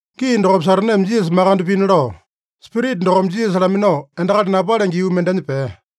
Gii dokopa Sataneme Jisasa makande pina lao, Spirita dokome Jisasa laminao endakali napalenge yuu mendenya pea.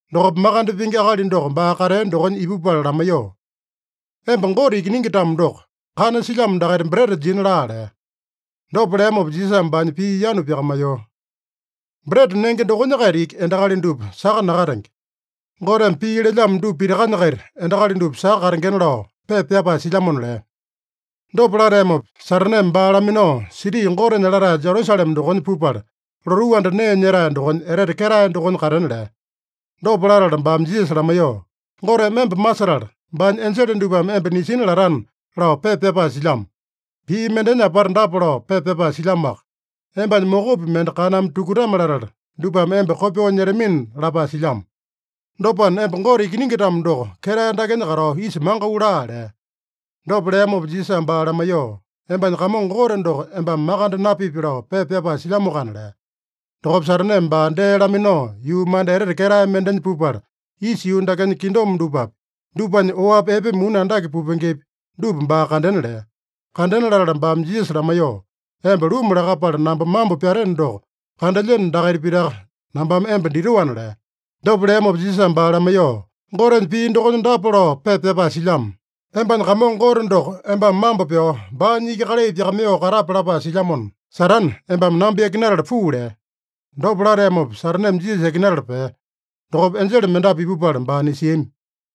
Dokopa makande pingi akali doko baa katea dokonya ipupala lamaiyoo, “Emba Gote Ikiningi-tamo doko, kana silyamo dakaita breta jina laa” lea. Dopa leamopa Jisasame baanya pii yanu pyakamaiyoo, “ ‘Breta nenge dokonya-kaita iki endakali dupa saka nakatenge. Goteme pii lelyamo dupa pitakanya-kaita endakali dupa saka katengena’ lao pepa pyapae silyamona” lea. Dopa lateamopa, Sataneme baa laminao siti Gotenya latae Jerusalema dokonya pupala, lotuu anda nee nyetae dokonya etete ketae dokonya katena lea. Dopa latala baame Jisasa lamaiyoo, “ ‘Goteme emba masetala, baanya enjele dupame emba nisina latana’ lao pepa pyapae silyamo. Pii mendenya apata dapa lao pepa pyapae silyamoaka: ‘Embanya mokopi mende kaname tukutame-latala, dupame emba kopyoo nyetamina’ lapae silyamo. Dopana, emba Gote Ikiningi-tamo doko, ketae dakenya katao isa mangau laa” lea. Dopa leamopa Jisasame baa lamaiyoo, “ ‘Embanya Kamongo Gote doko embame makande napipi’ lao pepa pyapae silyamoakana” lea. Dokopa Sataneme baa dee laminao, yuu manda etete ketae mendenya pupala, isa yuu dakenya kingdom dupapi, dupanya oapi epe muni andake pupengepi, dupa baa kandena lea. Kandena latala baame Jisasa lamaiyoo, “Emba luma lakapala namba mambo pyateno doko, kandelyeno dakaita pitaka nambame emba ditoana” lea. Dopa leamopa Jisasame baa lamaiyoo, “Gotenya pii dokonya dapa lao pepa pyapae silyamo: ‘Embanya Kamongo Gote doko embame mambo pyao, baanya iki kalai pyakamaiyoo katape’ lapae silyamona, Satane, embame namba yakinatala puu” lea. Dopa lateamopa Sataneme Jisasa yakinatala pea. Dokopa enjele mendapu ipupala baa nisiami.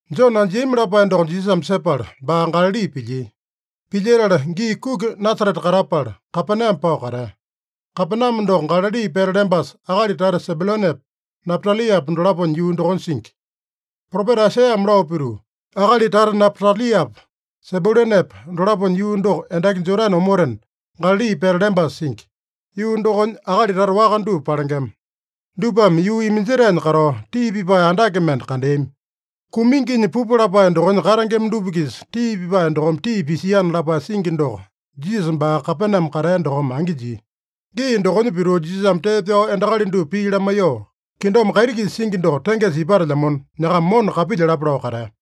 Jone anjiami lapae doko Jisasame sepala, baa Galali pilyia. Pilyetala gii kuki Nasarete katapala, Kapename pao katea. Kapename doko Galali pete lembasa, akali tata Sebyulanepa, Napataliapa dolaponya yuu dokonya singi. Propeta Aisaiyame lao pituu, “Akali tata Napataliapa, Sebyulanepa dolaponya yuu doko endaki Jodane omotena, Galali pete lembasa singi. Yuu dokonya akali tata waka dupa palengema. Dupame yuu iminjetaenya katao, tii pipae andake mende kandeami. Kuminginya pupu lapae dokonya katengema dupa-kisa tii pipae dokome tii pisiana” lapae singi doko Jisasa baa Kapename katea dokome angi jia. Gii dokonya pituu, Jisasame tee pyao endakali dupa pii lamaiyoo, “Kingdom kaiti-kisa singi doko tengesa ipatelyamona, nyakama mona kapilyalapa” lao katea.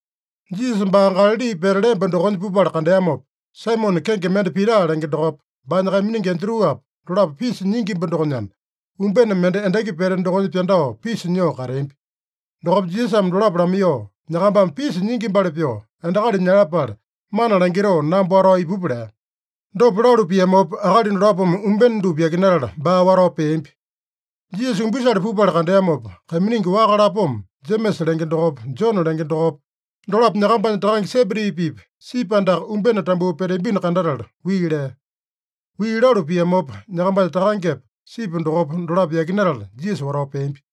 Jisasa baa Galali pete lemba dokonya pupala kandeamopa, Saimone kenge mende Pita lenge dokopa, baanya kaiminingi Andruapa, dolapo pisa nyingimba dokonyana, umbene mende endaki pete dokonya pyandao pisa nyoo kateambi. Dokopa Jisasame dolapo lamaiyoo, “Nyakambame pisa nyingimbali pyoo, endakali nyalapale mana langitoo, namba watao ipupa” lea. Dopa lalu piamopa, akali dolapome umbene dupa yakinatala, baa watao peambi. Jisasa umbisale pupala kandeamopa, kaiminingi waka lapoma, Jemesa lenge dokopa, Jone lenge dokopa, dolapo nyakambanya takange Sebedi-pipa sipi andaka umbene tambuu peteambino kandatala, wii lea. Wii lalu piamopa, nyakambanya takangepa, sipi dokopa, dolapo yakinatala Jisasa watao peambi.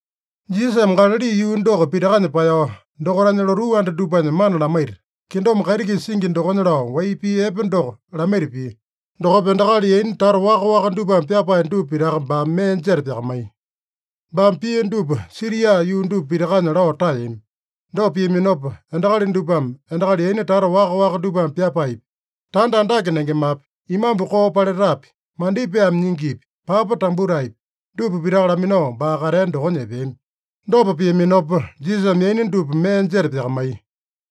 Jisasame Galali yuu doko pitakanya paeyao, dokaitanya lotuu anda dupanya mana lamaita, kingdom kaiti-kisa singi dokonya lao wai pii epe doko lamaita pia. Dokopa endakali yaina tata waka-waka dupame pyapae dupa pitaka baame mee jeta pyakamaiya. Baame pia dupa Siria yuu dupa pitakanya lao taeyami. Dopa piaminopa, endakali dupame endakali yaina tata waka-waka dupame pyapaepi, tanda andake nengemapi, imambu koo paletapi, mandipaeme nyingipi, papa tambutaepi, dupa pitaka laminao baa katea dokonya epeami. Dopa piaminopa, Jisasame yaina dupa mee jeta pyakamaiya.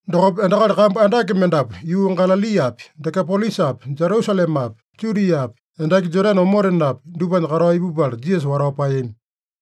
Dokopa endakali kambu andake mendapu yuu Galaliapi, Dekapolisapi, Jerusalemapi, Judiapi, endaki Jodane omotenapi, dupanya katao ipupala Jisasa watao paeyami.